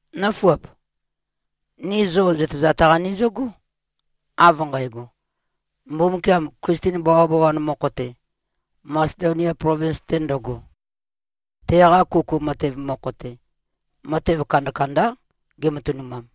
Nǿfuap! Ni zo zøtezat-qa nizøgó, av nqægo: Mbumbukiam Klisten bawabawan mokho-te, Masedonia plovins-te ndøgo, teqa kuku matev mokho-te, matev kandakandá gematønumam.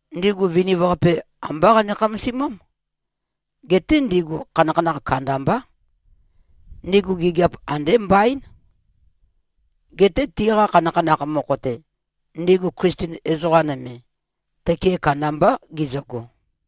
Ndigu viniv-qape, ambá qane-khamasimám. Geté ndigu khanakhanakh kandambá. Ndigu gigiap andé mbaín. Geté tiqa khanakhanakh mokho-te, ndigu Klisten ezoqa nøme, tøke kandambá gizøgo.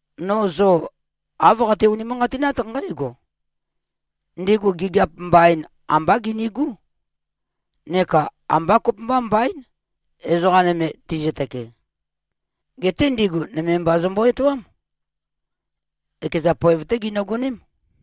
No zo āv qate-unimanqatinát nqǽgo: Ndigu gigiap mbain ambá ginigú. Neka ambá kopømba mbaín, ezoqa nøme tizøtøke. Geté ndigu nøme mba zømbo-etoám. Ekeza poev-té ginøgoném.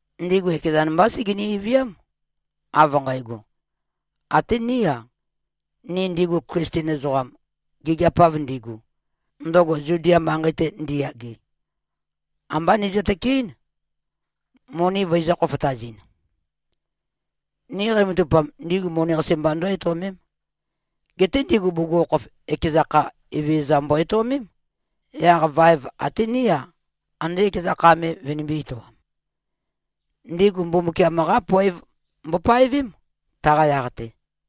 Ndigu ekezan mbá segeni-viám, av nqægo, “Até ní-a, ni ndigu Klisten ezoqam, gigiap-av ndigu, ndøgo Zudia manqei-te ndiyage, ambá nizø-tøkeɨ́n, moni vøizø̄-khofotazɨn.” Ni qeimatavupam, ndigu moni-qasi mba ndǿ-etøomém. Geté ndigu bugukhokhof, ekeza kha, Evezøza mbo-etøomém, yaq vaev até ní-a, ande ekeza kha me vønimbī-etoam. Ndigu Mbumbukiam-qá poev mbopaevém, taqa yaq-te.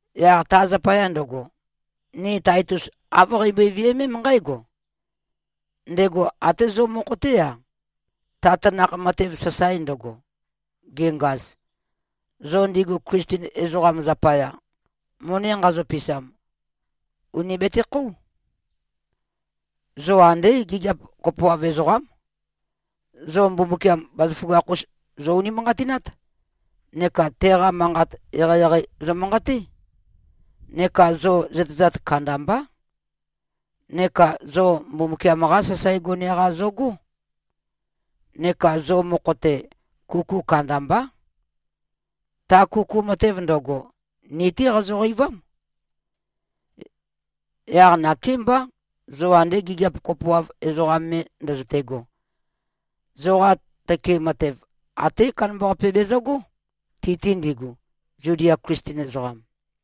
Yaq ta zapaya ndøgo, ni Taitus āv qeimbøe-viømém nqǽgo: Ndego até zo mokho-té-a, ta tanakh matev sasae ndøgo, gengaz, zo ndigu Klisten ezoqa zapaya moni nqazo-pisam, ùni betekhóu. Zo andé gigiap kopoav ezoqám. Zo Mbumbukiam bazaføgakh-us zo-unimanqatinát, neka teqa manqat eqeieqei zomanqaté. Neka zo zøtezat kandambá. Neka zo Mbumbukiam-qá sasae gone-qa zogó. Neka zo mokho-te, kuku kandambá. Ta kuku matev ndøgo, ni-té qazoqeivám. Yaq nakémbá, zo ande gigiap kopoav ezoqa me ndøzøte꞉go, zoqa tøke matev até kandambaqape bezøgó, ti-te ndigu, Zudia Klisten ezoqam.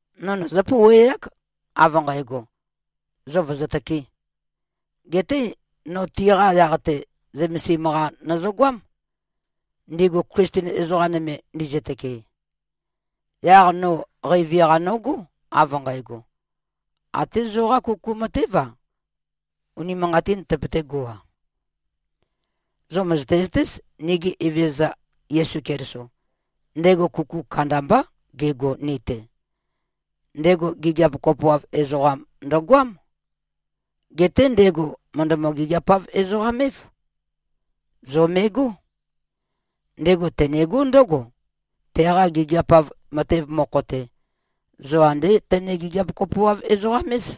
No nøzǿ-pouweák, av nqægo, zo vø̀zøtøkē. Geté no tiqa yaq-te zømesim-qa nøzøgoám, ndigu Klisten ezoqa nøme ndizøtøke. Yaq no qeivi-qa nogó, av nqægo, até zoqá kuku matév-a, unimanqatīn tøpøtégo-a. Zo mø̀zøte-zøtéz, nigi Evezøza Yesu Keliso, ndego kuku kandambá gego ni-te. Ndego gigiap kopoav ezoqam ndøgoám. Geté ndego mø̀ndømø-gigiapav-ezoqam-év. Zo me꞉gó. Ndego tenegó ndǿgo, teqa gigiap-av matev mokho-te, zo andé tøne-gigiap-kopoav-ezoqam-éz.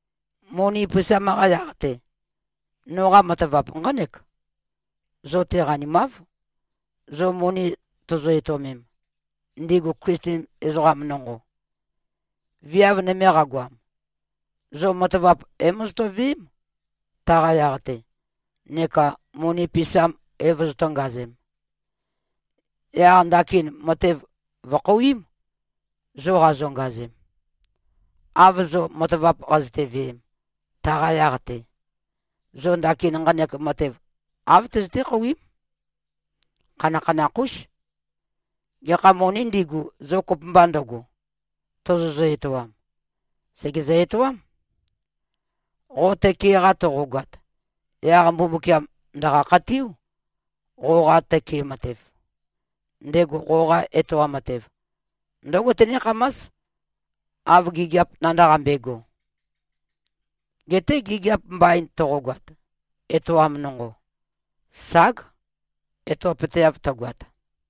Moni pisam-qa yaq-te, noqa matavap nqánek: Zo-te qanimáv, zo moni tozo-etøomem, ndigu Klisten ezoqam nonqo. Viav nøme qagoam, zo matavap é-mozoto-veém, taqa yaq-te, neka moni pisam é-vozotō-ngazem. Yaq ndakin matev vø̀khouím, zo qazongazem. Av zo matavap qazøte-veem, taqa yaq-te, zo ndakin nqanek matev āv tøzøté-khouím. Khanakhanakh-ús. Gekha monī ndigu, zo kopømba ndøgo, tozozø-etoam, sègezø-etoám. Qo tøke-qa toqogoat, yaq Mbumbukiam ndø̀qa-khatiú, qoqa tøke matev. Ndego qoqa etoam matev, ndǿgo tenékhamás, av gigiap nandaqambe꞉go. Geté gigiap mbain toqogoat, etoam nonqo, ság, etopøteav tøgoat.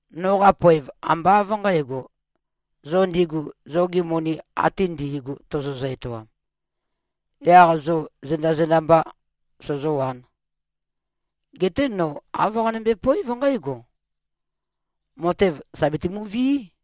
Noqa poev ambá av nqǣgo, zo ndigu zogi moni ate ndi꞉gu tozozø-etoam, yaq zo zenda-zenda mbā sozōwān. Geté no āv qanømbe-poév nqǽgo: Matev sà betumuvií.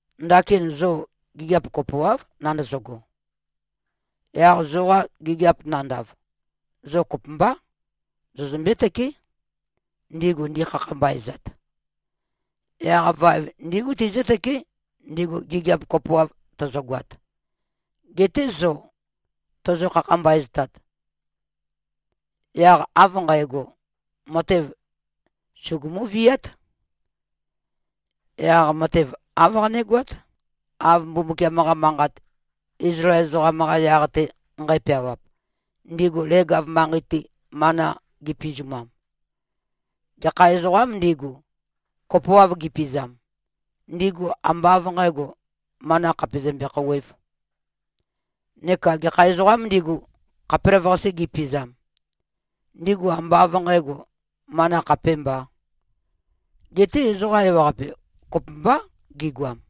Ndakin zo gigiap kopoáv nandøzøgo. Yaq zoqa gigiap nandav, zo kopømbá, zozømbé-tøké, ndigu ndikhakhambaezat. Yaq vaev ndígu tizǿtøké, ndigu gigiap kopoav tøzøgoat, gete zo tozo-khakhambaeztat. Yaq av nqægo, matev sugumú-víat. Yaq matev āv qanégoát, av Mbumbukiam-qa Manqat, Izlael ezoqam-qa yaq-te nqæpeawap, ndigu leg-av manqei-te mana gipizumam, “Gekha ezoqām ndigu, kopoav gipizam, ndigu ambá av nqǣgo, mana khàpe zømbe-khouwēv. Neka gekha ezoqām ndigu, khapelavøqase gipizam, ndigu ambá av nqǣgo, mana khapémbá. Geté ezoqa ewaqape kopømbá gigoam.”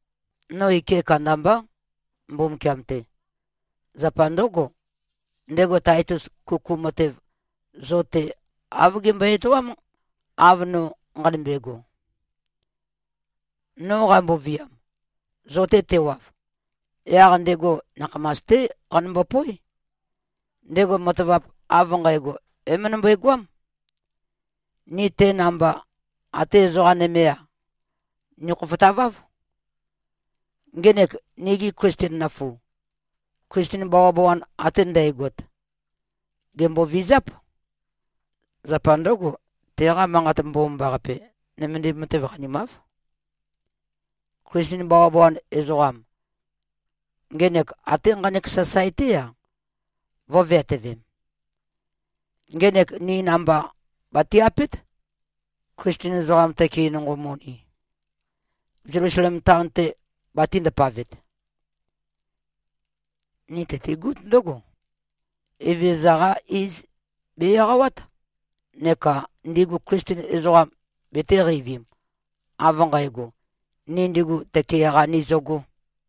No ike kandambá, Mbumbukiam-te. Zapa ndǿgo, ndego Taitus kuku matev zo-te, āv gembøe-etoám, av no nqanømbe꞉go. No qamboviam, zo-te tewav, yaq ndego nakhamas-té qanømbo-póe. Ndego matavap av nqægo, é-møndømbøe-goám. Ni te namba, até ezoqa nømé-a, nikhofotaváv. Ngenek nigi Klisten nøfu, Klisten bawabawan ate ndægot, gèmbovizáp. Zapa ndǿgo, teqa Manqat Mbomambaqape nømendim matev qanimáv. Klisten bawabawan ezoqam, ngenek até nqanek sasae-té-a, vø̄veatøvem: Ngenek ní namba bati-apét, Klisten ezoqam tøke nonqo moni, Zelusalem taon-te batī-ndapavet. Ni tøtigút ndǿgo: Evezøza-qá iz be-eqawát neka ndigu Klisten ezoqam betēqeivim, av nqægo, ni ndigu tøke-qa nizøgō.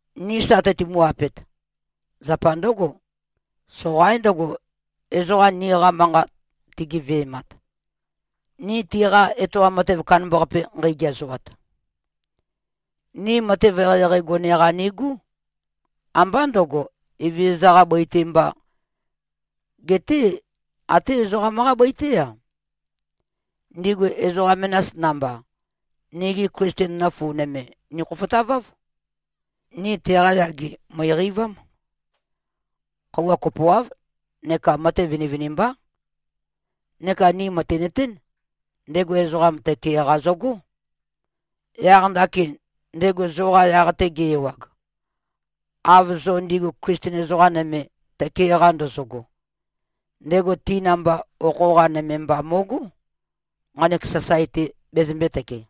Ni sa teitumu-apet, zapa ndǿgo: Soqaín ndøgo, ezoqa niqa manqa tigeve꞉mat, ni tiqa etoam matev kandambaqape nqeigeazoat. Ni matev eqeieqei gone-qa nigú. Ambá ndø̄go, Evezøza-qā bøi-te mbā, geté até ezoqam-qá bøi-té-a. Ndigu ezoqa menas namba, nigi Klisten nøfu nøme nikhofotaváv. Ni teqa yage mø̀iqeivám. Khøuwa kopoáv neka matev vinivinimbá. Neka ni mø̀tinøtén: Ndego ezoqa tøke-qa zøgó. Yaq ndakin, ndego zoqa yaq-te ge-ewag, av zo ndigu Klisten ezoqa nøme tøke-qa ndozogo, ndego ti namba okho-qa nøme mba mo꞉gó, nqanek sasae-te bezømbētøke.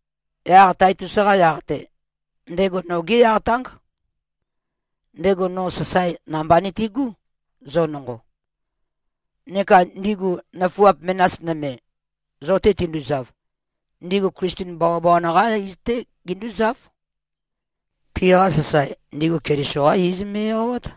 Yaq Taitus-qa yaq-te, ndego nogé yaq táng. Ndego no sasae namba, nìtigú, zo nonqo. Neka ndigu nøfuap menas nøme, zo-te tinduzav, ndigu Klisten bawabawan-qá iz-té gindúzáv. Tiqa sasae, ndigu Keliso-qá iz me꞉-eqawát.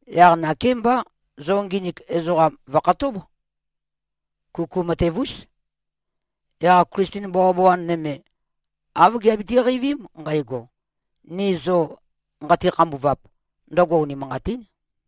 Yaq nakémbá, zo nginik ezoqam vø̀khatób. Kuku matev-ús. Yaq Klisten bawabawan nøme, āv giabiti-qeivím nqægo, ni zo nqati-khambuvap, ndøgo unimanqatín.